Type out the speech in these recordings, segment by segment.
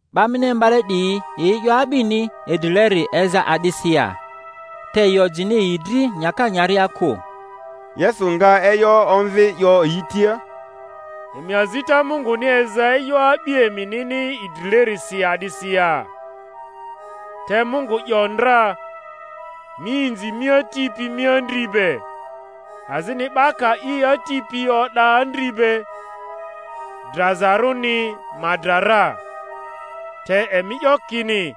'Ba mini imbale 'diyi yi e'yo a'bini idrileri eza a'disi ya? Te yi ojini yi dri nyaka nyaria kᴜ. Yesu nga e'yo omvi, 'yo yi tia, Emi azita Munguni eza e'yo a'bi eminini idrilerisi a'disi ya? Te Mungu 'yo ndra, Mi inzi mi ati pi mi andri be; azini, 'Ba ka i ati pi o'da andri be, drazarᴜni ma dra ra. Te emi 'yo kini,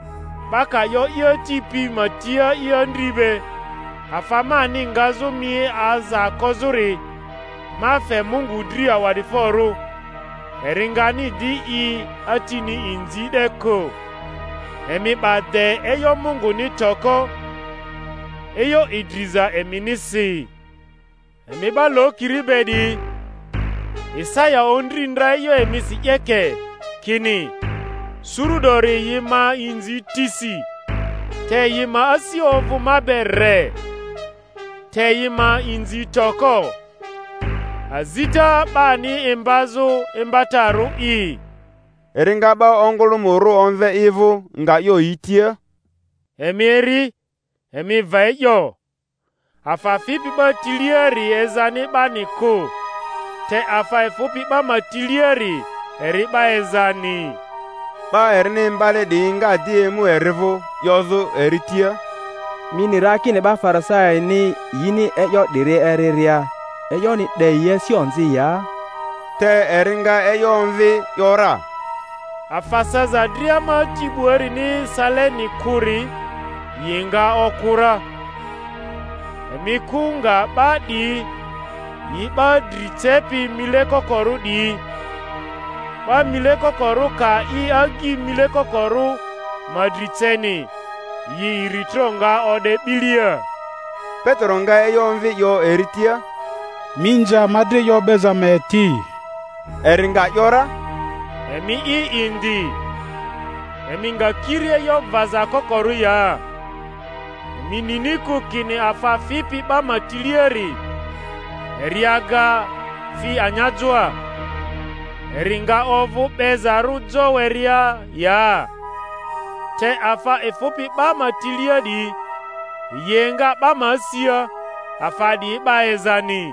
'Ba ka 'yo i ati pi ma tia i andri be, Afa mani ngazᴜ mi aza kozᴜri, ma fe Mungu dri awa'diforᴜ; eri ngani di i atini inzi 'de kᴜ. Emi 'ba de e'yo Munguni toko, e'yo idriza eminisi. Emi 'ba lokiri be 'diyi! Isaya ondri ndra e'yo emisi 'yeke, kini: Suru 'dori yi ma inzi tisi, te yi ma asi ovᴜ ma be re; te yi ma inzi toko, azita 'bani imbazᴜ imbatarᴜ'i. Eri nga 'ba ongᴜlᴜmᴜrᴜ omve i vᴜ, nga 'yo yi tia, Emi eri, emi va e'yo: afa fipi 'ba tiliari ezani 'bani kᴜ, te afa efᴜpi 'ba ma tiliari eri 'ba ezani. 'Ba erini imbale 'diyi nga di emu eri vᴜ, 'yozᴜ eri tia, Mi ni ra kini 'ba Farisaini yini e'yo 'diri eriria, e'yoni 'de yi asia onzi ya? Te eri nga e'yo omvi, ‘yora, Afa saza dria ma Ati 'buarini saleni kᴜri, yi nga oku ra. Emi kᴜ nga 'ba 'diyi; yi 'ba dri cepi mile kokorᴜ 'diyi. 'Ba mile kokorᴜ ka i agyi mile kokorᴜ ma dri ceni, yi iritro nga o'de 'bilia. Petero nga e'yo omvi, 'yo eri tia, Mi nze ama dri e'yo o'beza ma eti. Eri nga ‘yora, Emi'i indi, emi nga kiri e'yo vaza kokorᴜ ya? Emi nini kᴜ kini afa fipi 'ba ma tileari, eri aga fi anyajoa, eri nga ovᴜ 'bezarᴜ jo werea ya? Te afa efᴜpi 'ba ma tilia 'diyi, yi enga 'ba ma asia; afa 'diyi 'ba ezani.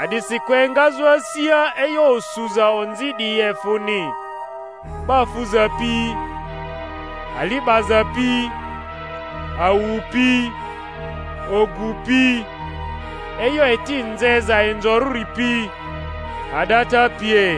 A'disikᴜ engazᴜ asia e'yo osuza onzi 'diyi efᴜni, 'ba fuza pi, ali 'baza pi, awu pi, ogu pi, e'yo eti nzeza inzorᴜri pi, a'data pie.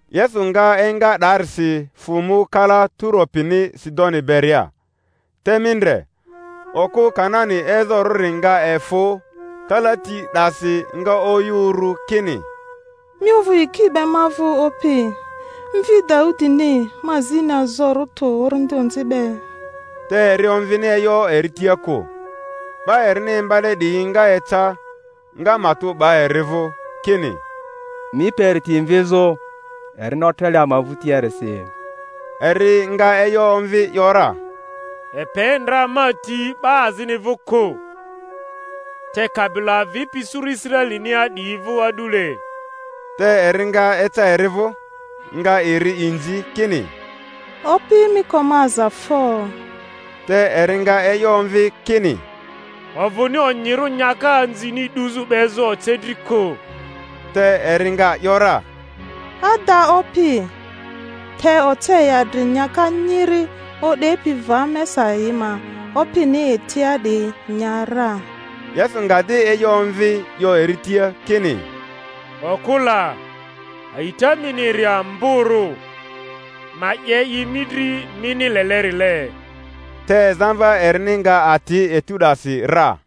Yesu nga enga 'daarisi, fᴜ mu kala Turo pini Sidoni beria. Te mi ndre, okᴜ Kanani ezorᴜri nga efᴜ kalati 'dasi, nga oyᴜ uru kini, Mi ovᴜ yiki be ma vᴜ, Opi, mvi Daudini; ma zini azorᴜ tᴜ orindi onzi be. Te eri omvini e'yo eri tia kᴜ. 'Ba erini imbale 'diyi nga eca, nga matᴜ 'ba eri vᴜ kini, Mi pe eri ti mvizᴜ, erini otrele ama vᴜtiarisi. Eri nga e'yo omvi ‘yora, Epe ndra ma ti 'ba azini vᴜ kᴜ, te kabilo avipi suru Israelinia 'diyi vᴜ a'dule. Te eri nga eca eri vᴜ, nga eri inzi, kini, Opi, mi ko ma aza fo! Te eri nga e'yo omvi kini, Ovᴜni onyirᴜ nyaka anzini 'duzᴜ 'bezᴜ oce dri kᴜ. Te eri nga ‘yora, Ada, Opi, te oce yi adri anyaka nyiri o'depi va mesa yi ma opini etia 'diyi nya ra. Yesu nga di e'yo omvi, 'yo eri tia kini, Okᴜ la, a'ita mini eri amborᴜ! Ma 'ye i mi dri mini lelerile. Te zamva erini nga ati etu 'dasi ra.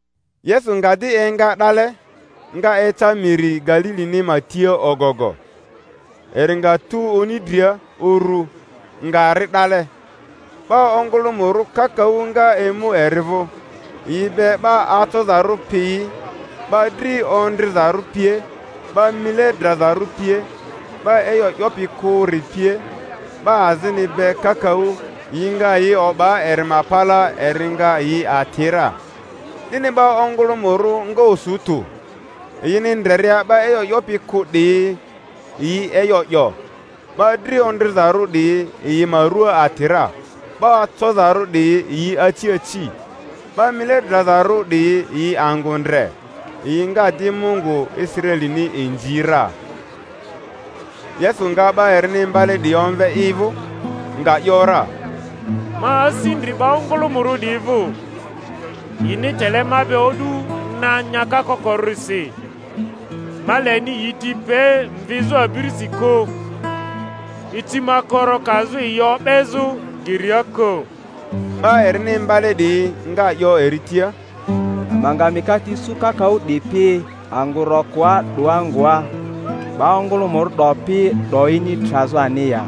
Yesu nga di enga 'dale, nga eca miri Galilini ma tia ogogo. Eri nga tu oni dria uru, nga ri 'dale. 'Ba ongᴜlᴜmᴜrᴜ kakaᴜ nga emu eri vᴜ, yi be 'ba acozarᴜ piyi, 'ba dri ondrizarᴜ pie, 'ba mile drazarᴜ pie, 'ba e'yo 'yopi kᴜri pie, 'ba azini be kakaᴜ; yi nga yi o'ba eri ma palaa, eri nga yi ati ra. 'Dini 'ba ongᴜlᴜmᴜrᴜ nga osu tᴜ, yini ndreria 'ba e'yo 'yopi kᴜ 'diyi yi e'yo 'yo, 'ba dri ondrizarᴜ 'diyi yi ma rua ati ra, 'ba acozarᴜ 'diyi yi aci aci, 'ba mile drazarᴜ 'diyi yi angᴜ ndre; yi nga di Mungu Israelini inzi ra. Yesu nga 'ba erini imbale 'diyi omve i vᴜ, nga ‘yora, Ma asi ndri 'ba ongᴜlᴜmᴜrᴜ 'diyi vᴜ, yini tele ma be o'du na nyaka kokorᴜrisi; ma leni yi ti pe mvizᴜ abirisi kᴜ, icimakoro kazᴜ yi o'bezᴜ geria kᴜ. 'Ba erini imbale 'diyi nga 'yo eri tia, Ama nga mikate isu kakaᴜ 'dipi, angᴜ rokoa 'doa ngoa, 'ba ongᴜlᴜmᴜrᴜ 'dopi 'doyini trazᴜ ani ya?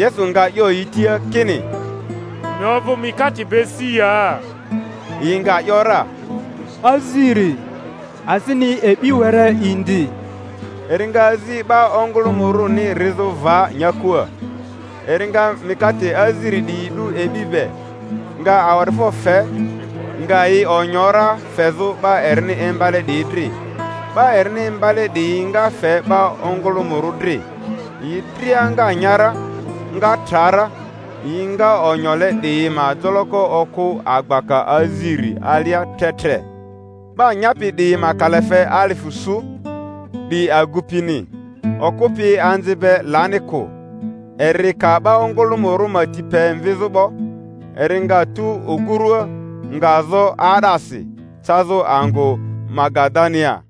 Yesu nga 'yo yi tia kini, Emi ovᴜ mikate be si ya? Yi nga ‘yora, Aziri, azini e'bi were indi. Eri nga azi 'ba ongᴜlᴜmᴜrᴜni rizᴜ va nyakua, eri nga mikate aziri 'diyi 'du e'bi be, nga awa'difo fe, nga yi onyo ra fezᴜ 'ba erini imbale 'diyi dri, 'ba erini imbale 'diyi nga fe 'ba ongᴜlᴜmᴜrᴜ dri. Yi dria nga nya ra, nga tra ra; yi nga onyole 'diyi ma joloko okᴜ abaka aziri alia tre tre. 'Ba nyapi 'diyi ma kalafe alifᴜ su, 'di agupini; okᴜ pi anzi be lani kᴜ. Eri ka 'ba ongᴜlᴜmᴜrᴜ ma ti pe mvizᴜ 'bo, eri nga tu ogurua, nga zo 'aa'dasi, cazᴜ angᴜ Magadania.